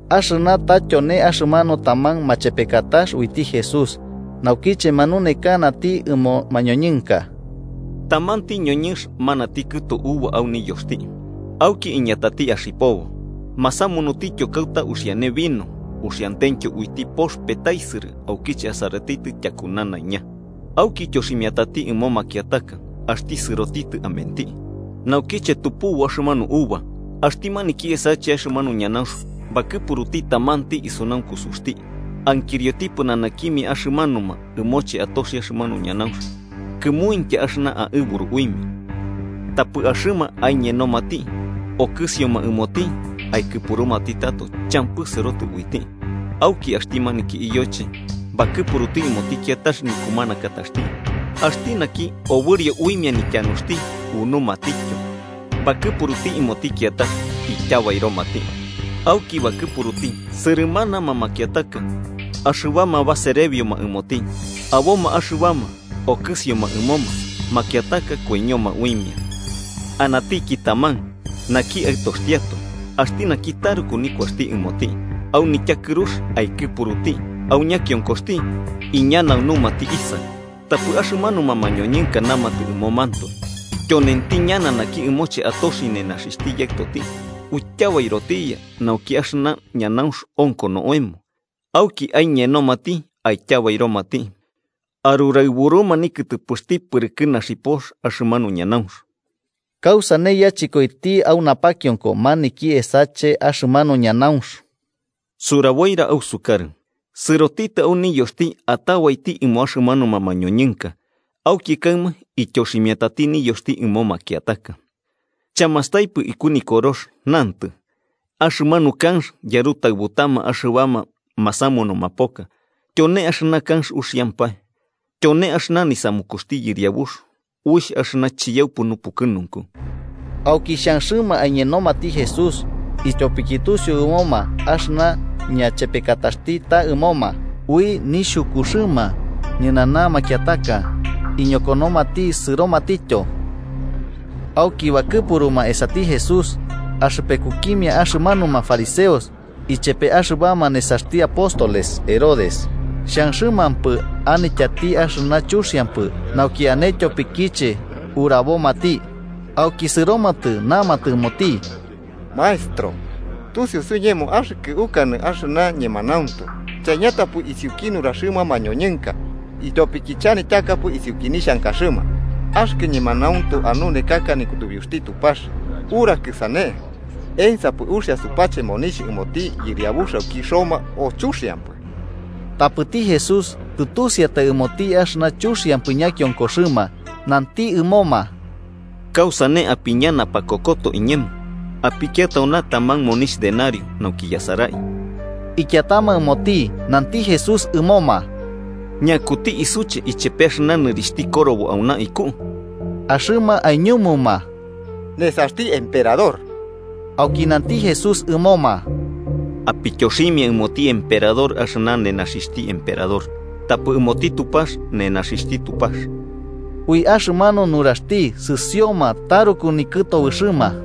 Axɨna ta tyone axɨmanu taman machepekatax uiti Jesús naukiche manunekanati ɨmo mañoñɨnka: “Tamanti ñoñɨnx manati kɨtu uva au niyoxti auki iñatati axipobo. Masamunutityo kauta uxiane vino uxiantentyo uiti pox petaisɨrɨ aukiche asaratitɨ tyaku nanaiña. Auki ityoximiatati ɨmo makiataka axti sɨrotitɨ amenti. Naukiche tupubu axɨmanu uva, axti maniki esache axɨmanu ñanaunx bakɨpuruti tamanti isunankusuxti ankirioti pɨnanakimia axɨmanuma ɨmoche atoxi axɨmanu ñanaunx kɨmuintya axɨna aɨburu uimia. Tapɨ axɨma aiñenomati, okɨsioma ɨmoti aikɨpurumati tato champɨ sɨrotɨ uiti. Auki axti maniki iyoche bakɨpuruti ɨmoti kiatax nikumanakataxti, axti naki obɨrio uimia nityanuxti unumatityo. Bakɨpuruti ɨmoti kiatax, ityabairomati. Auki bakɨpuruti sɨrɨmanama makiataka axɨbama baserebioma ɨmoti. Aboma axɨbama okɨsioma ɨmoma makiataka koiñoma uimia. “Anatiki taman: Naki aɨtoxtiatoe, axti naki taruku nikuaxti ɨmoti. Au nityakɨrux aikɨpuruti, au ñakionkoxti: ‘Iñanaunumati Isaɨ’. Tapɨ axɨmanuma mañoñɨnka namatɨ ɨmomantoe: ‘Tyonenti ñana naki ɨmoche atoxi nenaxixhti yaɨtoti. Uityabairotiya, nauki axɨna ñanaunx onko oemo.’ Auki aiñenomati, aityabairomati arɨraɨbuma nikɨtɨpɨxti pɨrɨkɨ naxipox axɨmanu ñanaunx. “¿Kausane yachɨkoiti au napakionko maniki esache axɨmanu ñanaunx? Suraboira ausukarɨ. Sɨrotitɨ au niyoxti atabaiti ɨmo axɨmanuma mañoñɨnka, auki kaɨma ityoximiatati niyoxti ɨmo makiataka. “¿Chamastaipɨ iku Nikorox? Nantɨ: ‘Axɨmanu kanx yarutaɨbutama axɨbama masamunuma poka tyone axɨna kanx uxiampae. Tyone axɨna nisamukuxti Yɨriabux, uixh axɨna chiyaupɨ nupukɨnunku.’” Auki xhanxɨma aiñenomati Jesús, ityopiki tusiu ɨmoma axɨna ñachepekataxti ta ɨmoma. Ui nixhukuxɨma ñɨnana makiataka, iñokonomati sɨromatityo. Auki bakɨpuruma esati Jesús axɨpekukimia axɨmanuma fariseos ichepe axɨbama nesaxti apóstoles Herodes, xhanxɨmampɨ anityati axɨna chuxiampɨ nauki ane tyopikiche urabomati. Auki sɨromatɨ namatɨ ɨmoti: –Maestro, tusiu suiñemo axɨkɨ ukanɨ axɨna ñemanauntu, chaiñatapɨ isiuki nuraxɨma mañoñɨnka, ityopiki chanityakapɨ isiuki nixhankaxɨma. Axɨkɨ ñemanauntu anunekaka nikutubiuxti Tupax. Urakɨ sane. ¿Ensapɨ uxia supache monixh ɨmoti yɨriabux aiki Roma, o chuxiampɨ? Tapɨti Jesús, tɨtusiatai ɨmoti axɨna chuxiampɨ ñakionkoxɨma, nanti ɨmoma: –¿Kausane apiña napakokoto iñemo? Apikia tauna taman monixh denario, nauki yasarai. Ikiatama ɨmoti, nanti Jesús ɨmoma: –¿Ñakuti isuche ichepe axɨna nɨrixhti korobo auna iku? Axɨma aiñumuma: –Nesaxti emperador. Auki nanti Jesús ɨmoma: –Apityoximia ɨmoti emperador axɨna nenaxixhti emperador, tapɨ ɨmoti Tupax nenaxixhti Tupax. Ui axɨmanu nuraxti sɨsioma taruku nikɨtobɨxɨma.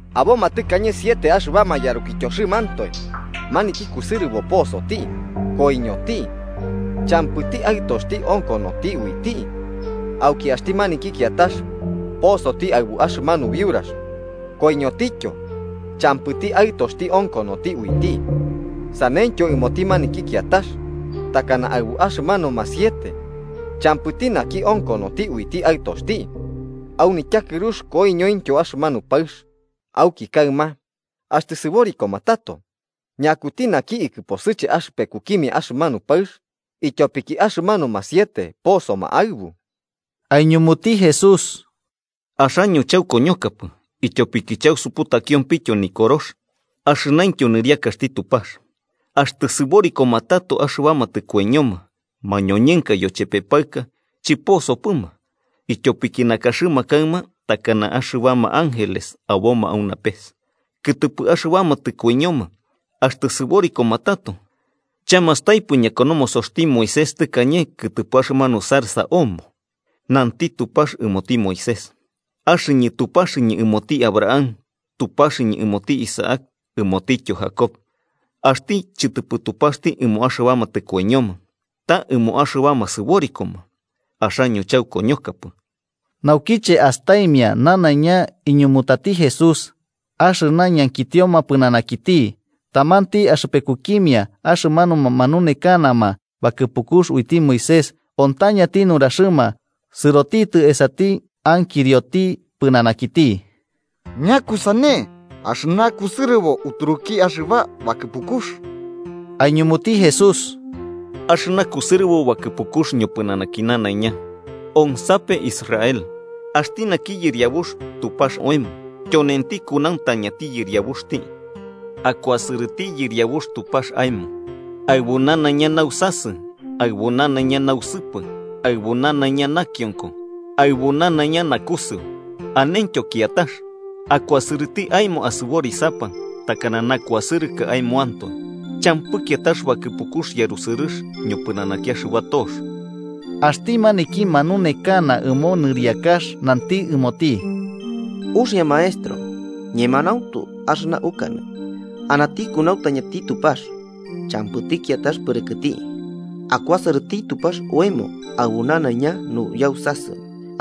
Aboma tɨkañe siete axɨbama yarukityoxɨmantoe, maniki kusɨrɨbo posoti, koiñoti champɨti aɨtoxti onkonoti uiti. Auki axti maniki kiatax posoti aɨbu axɨmanu biurax, koiñotityo champɨti aɨtoxti onkonoti uiti. Saneityo ɨmoti maniki kiatax, takana aɨbu axɨmanuma siete. Champɨti naki onkonoti uiti aɨtoxti. Au nityakɨrux koiñointyo axɨmanu paɨx. Auki kaɨma, axtɨ sɨborikoma tato, ¿ñakuti naki ikɨposɨche axɨpekukimia axɨmanu paɨx, ityopiki axɨmanuma siete posoma aɨbu? Aiñumuti Jesús: –Axaño chaukoñokapɨ, ityopiki chausuputakiompɨ Nikorox axɨnaintyo niriakaxti Tupax. Axtɨ sɨborikoma tato axɨbama tɨkoiñoma, mañoñɨnka yochepe paɨka chɨposopɨma, ityopiki nakaxɨma kaɨma takana axɨbama ángeles aboma au napes. Kɨtɨpɨ axɨbama tɨkoiñoma axtɨ sɨborikoma tato, ¿chamastaipɨ ñakonomosoxti Moisés tɨkañe kɨtɨpɨ axɨmanu zarza omo? Nanti Tupax ɨmoti Moisés: ‘Axɨñɨ Tupaxɨñɨ ɨmoti Abraham, Tupaxɨñɨ ɨmoti Isaac ɨmotityo Jacob.’ ¡Axti chɨtɨpɨ Tupaxti ɨmo axɨbama tɨkoiñoma, ta ɨmo axɨbama sɨborikoma! Axaño chaukoñokapɨ. Naukiche astaimia nanaiña iñumutati Jesús axɨna ñankitioma pɨnanakiti, tamanti axɨpekukimia axɨmanuma manunekanama bakɨpukux uiti Moisés ontañati nuraxɨma, sɨrotitɨ esati ankirioti pɨnanakiti: –¿Ñakusane axɨna kusɨrɨbo uturuki axɨba bakɨpukux? Aiñumuti Jesús: –Axɨna kusɨrɨbo bakɨpukux ñopɨnanaki nanaiña: ‘Onsape, Israel: Axti naki Yɨriabux Tupax oemo tyonenti kunauntañati Yɨriabuxti. Akuasɨrɨti Yɨriabux Tupax aemo aɨbu nanaiña nausasɨ, aɨbu nanaiña nausɨpɨ, aɨbu nanaiña nakionko aɨbu nanaiña naukusɨu.’ Anentyo kiatax: ‘Akuasɨrɨti aemo asɨborisapa takana nakuasɨrɨkɨ aemoantoe.’ Champɨ kiatax bakɨpukux yarusɨrɨx ñopɨnanaki axɨba tox. Axti maniki manunekana ɨmo nɨriakax nanti ɨmoti: –Uxia, Maestro. Ñemanauntu axɨna ukanɨ: Anati kunauntañati Tupax, champɨti kiatax Pɨrɨkɨti. Akuasɨrɨti Tupax oemo aɨbu nanaiña nuyausasɨ,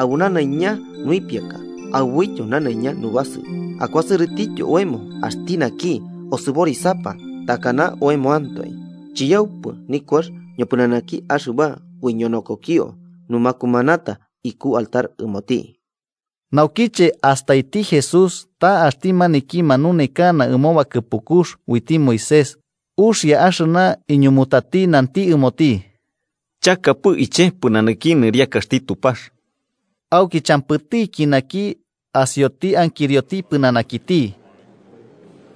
aɨbu nanaiña nuipiaka aɨbuityo nanaiña nubasɨu, akuasɨrɨtityo oemo axti naki osɨborisapa takana oemoantoe, chiyaupɨ nikuax ñopɨnanaki axɨba uiñonokokio numakumanata iku altar ɨmoti. Naukiche astaiti Jesús ta axti maniki manunekana ɨmo bakɨpukux uiti Moisés uxia axɨna iñumutati, nanti ɨmoti: –Chakapɨ iche pɨnanaki nɨriakaxti Tupax. Auki champɨtiki naki asioti ankirioti pɨnanakiti.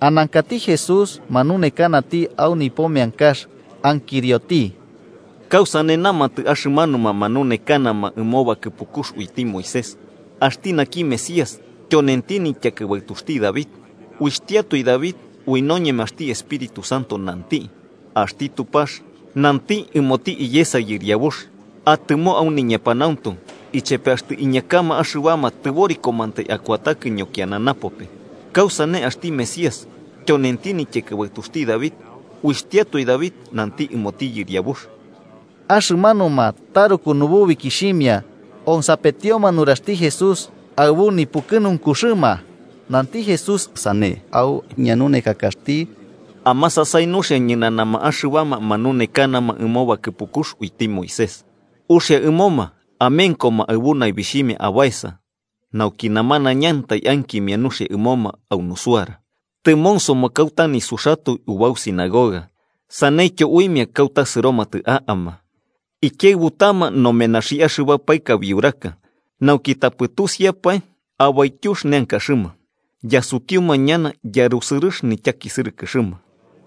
Anankati Jesús manunekanati au nipo meankax, ankirioti: –¿Kausane namatɨ axɨmanuma manunekanama ɨmo bakɨpukux uiti Moisés, axti naki Mesías, tyonenti nityakɨbaɨtuxti David? Uixhtiatoi David, ui noñemaxti Espíritu Santo, nanti: ‘Axti Tupax nanti ɨmoti iyesa Yɨriabux. Atɨmo au niñepanauntu, ichepe axtɨ iñakama axɨbama tɨborikomantai akuatakɨ ñokiana napope’ ¿Kausane axti Mesías tyonenti nityakɨbaɨtuxti David, axtiatoe David nanti ɨmoti Yɨriabux? Axɨmanuma, taruku nububikixhimia, onsapetioma nuraxti Jesús aɨbu nipukɨnunkuxɨma. Nanti Jesús sane au ñanunekakaxti: “Amasasai nuxia ñɨnanama axɨbama manunekanama ɨmo bakɨpukux uiti Moisés, uxia ɨmoma amenkoma aɨbu naibixhimia abaesa nauki namanañantai ankimia nuxia ɨmoma au nusuara. Tɨmonsoma kauta nisuxatoe ubau sinagoga saneityo uimia kauta sɨromatɨ a'ama. Ikiaɨbutama nomenaxi axɨba paɨka biurax, nauki tapɨ tusiapae abaityux neankaxɨma. Yasutiuma ñana yarusɨrɨx nityakisɨrɨkɨxɨma.”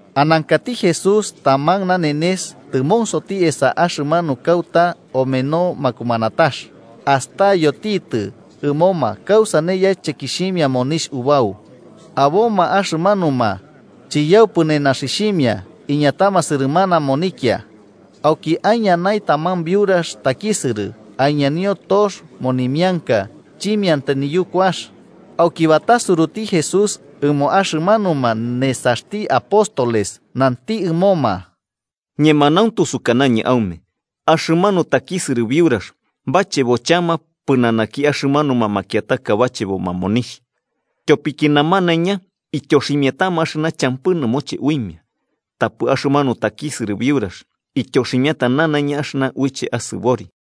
Anankati Jesús taman nanenes tɨmonsoti esa axɨmanu kauta omeno makumanatax, astayotitɨ ɨmoma kausane yachekixhimia monixh ubau. Aboma axɨmanuma chiyaupi nenaxixhimia iñatama sɨrɨmana monikia. Auki aiñanai taman biurax takisɨrɨ, aiñanio tox monimianka chimiantai niyukuax. Auki batasuruti Jesús ɨmo axɨmanuma nesaxti apóstoles, nanti ɨmoma: –Ñemanauntu sukanañɨ aume, axɨmanu takisɨrɨ biurax bachebo chama pɨnanaki axɨmanuma makiataka bacheboma monixh. Tyopiki namanaiña ityoximiatama axɨna champɨ nɨmoche uimia, tapɨ axɨmanu takisɨrɨ biurax ityoximiata nanaiña axɨna uiche asɨbori.